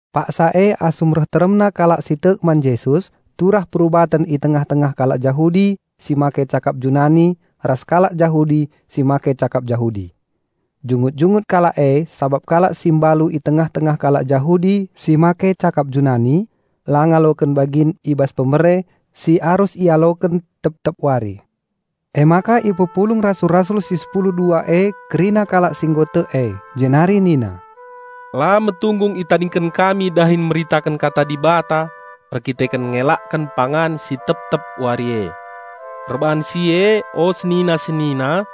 Paksa e, asum reh teremna kalak si tek man Jesus, turah perubaten i tengah-tengah kalak Jahudi si make cakap Junani ras kalak Jahudi si make cakap Jahudi. Jungut-jungut kalak e sabap kalak si mbalu i tengah-tengah kalak Jahudi si make cakap Junani la ngaloken bagin i bas pemere si arus ialoken tep-tep wari. Emaka ipepulung rasul-rasul si sepulu dua e kerina kalak si nggo tek e, jenari nina, "La metunggung itadingken kami dahin meritaken kata Dibata erdandanken ngelaken pangan si tep-tep wari e. Perbahan si e o senina-senina,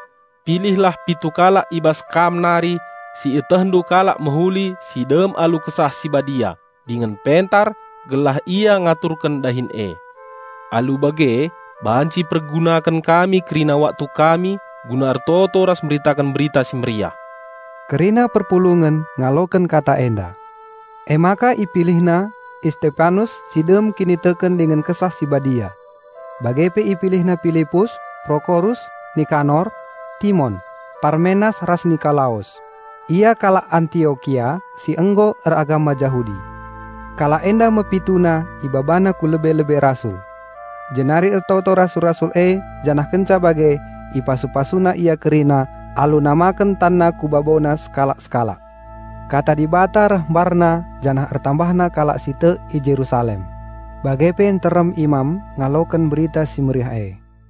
pilihlah pitu kalak i bas kam nari si ietehndu kalak mehuli si dem alu Kesah Si Badia dingen pentar, gelah ia ngaturken dahin e. Alu bage banci ipergunaken kami kerina waktu kami guna ertoto ras meritaken Berita Si Mehuli." Kerina perpulungen ngaloken kata enda. Emaka ipilihna Istepanus si dem kiniteken dingen Kesah Si Badia. Bage pe ipilihna Pilipus, Prokorus, Nikanor, Timon, Parmenas ras Nikolaus; ia kalak Antiokia si nggo eragama Jahudi. Kalak enda me pituna ibabana ku lebe-lebe rasul. Jenari ertoto rasul-rasul e janah kenca bage ipasu-pasuna ia kerina alu namaken tanna ku babona sekalak-sekalak. Kata Dibata reh mbarna janah ertambahna kalak si tek i Jerusalem. Bage pe nterem imam ngaloken Berita Si Mehuli e.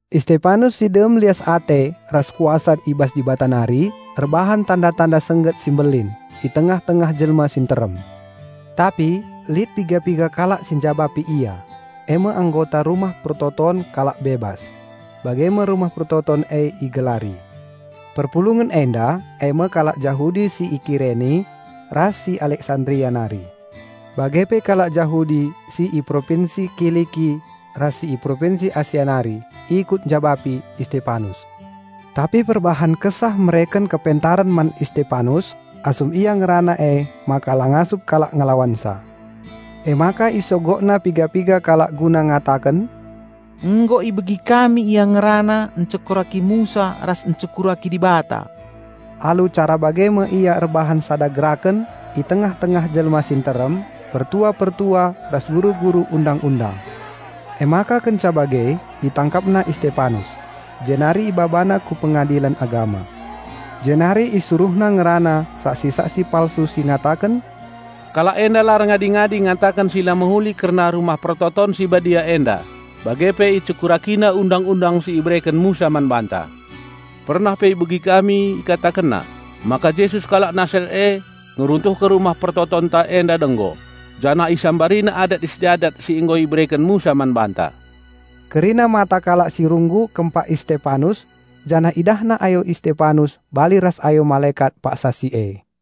Istepanus si dem lias ate ras kuasa i bas Dibata nari erbahan tanda-tanda sengget si mbelin i tengah-tengah jelma si nterem. Tapi lit piga-piga kalak si njabapi ia, eme anggota rumah persembahen Kalak Bebas. (Bage me rumah persembahen e igelari.) Perpulungen enda eme kalak Jahudi si i Kireni ras si i Aleksanderia nari. Bage pe kalak Jahudi si i Propinsi Kiliki ras si i Propinsi Asia nari ikut njabapi Istepanus. Tapi perbahan Kesah mereken kepentaren man Istepanus asum ia ngerana emaka la ngasup kalak ngelawansa. Emaka isogokna piga-piga kalak guna ngataken, "Nggo ibegi kami ia ngerana encekuraki Musa ras encekuraki Dibata." Alu cara bage me ia erbahan sada geraken i tengah-tengah jelma si nterem, pertua-pertua ras guru-guru Undang-undang. Emaka kenca bage itangkapna Istepanus, jenari ibabana ku Pengadilen Agama. Jenari isuruhna ngerana saksi-saksi palsu si ngataken, "Kalak enda la erngadi-ngadi ngataken si la mehuli kerna Rumah Pertoton si Badia enda bage pe icekurakina Undang-undang si ibereken Musa man banta. Pernah pe ibegi kami ikatakenna maka Jesus kalak Nasaret e ngeruntuhken Rumah Pertotonnta enda denggo janah IsambariNa adat-istiadat si nggo ibereken Musa man banta." Kerina mata kalak si runggu kempak Istepanus, janah idahna ayo Istepanus bali ras ayo malekat paksa si e.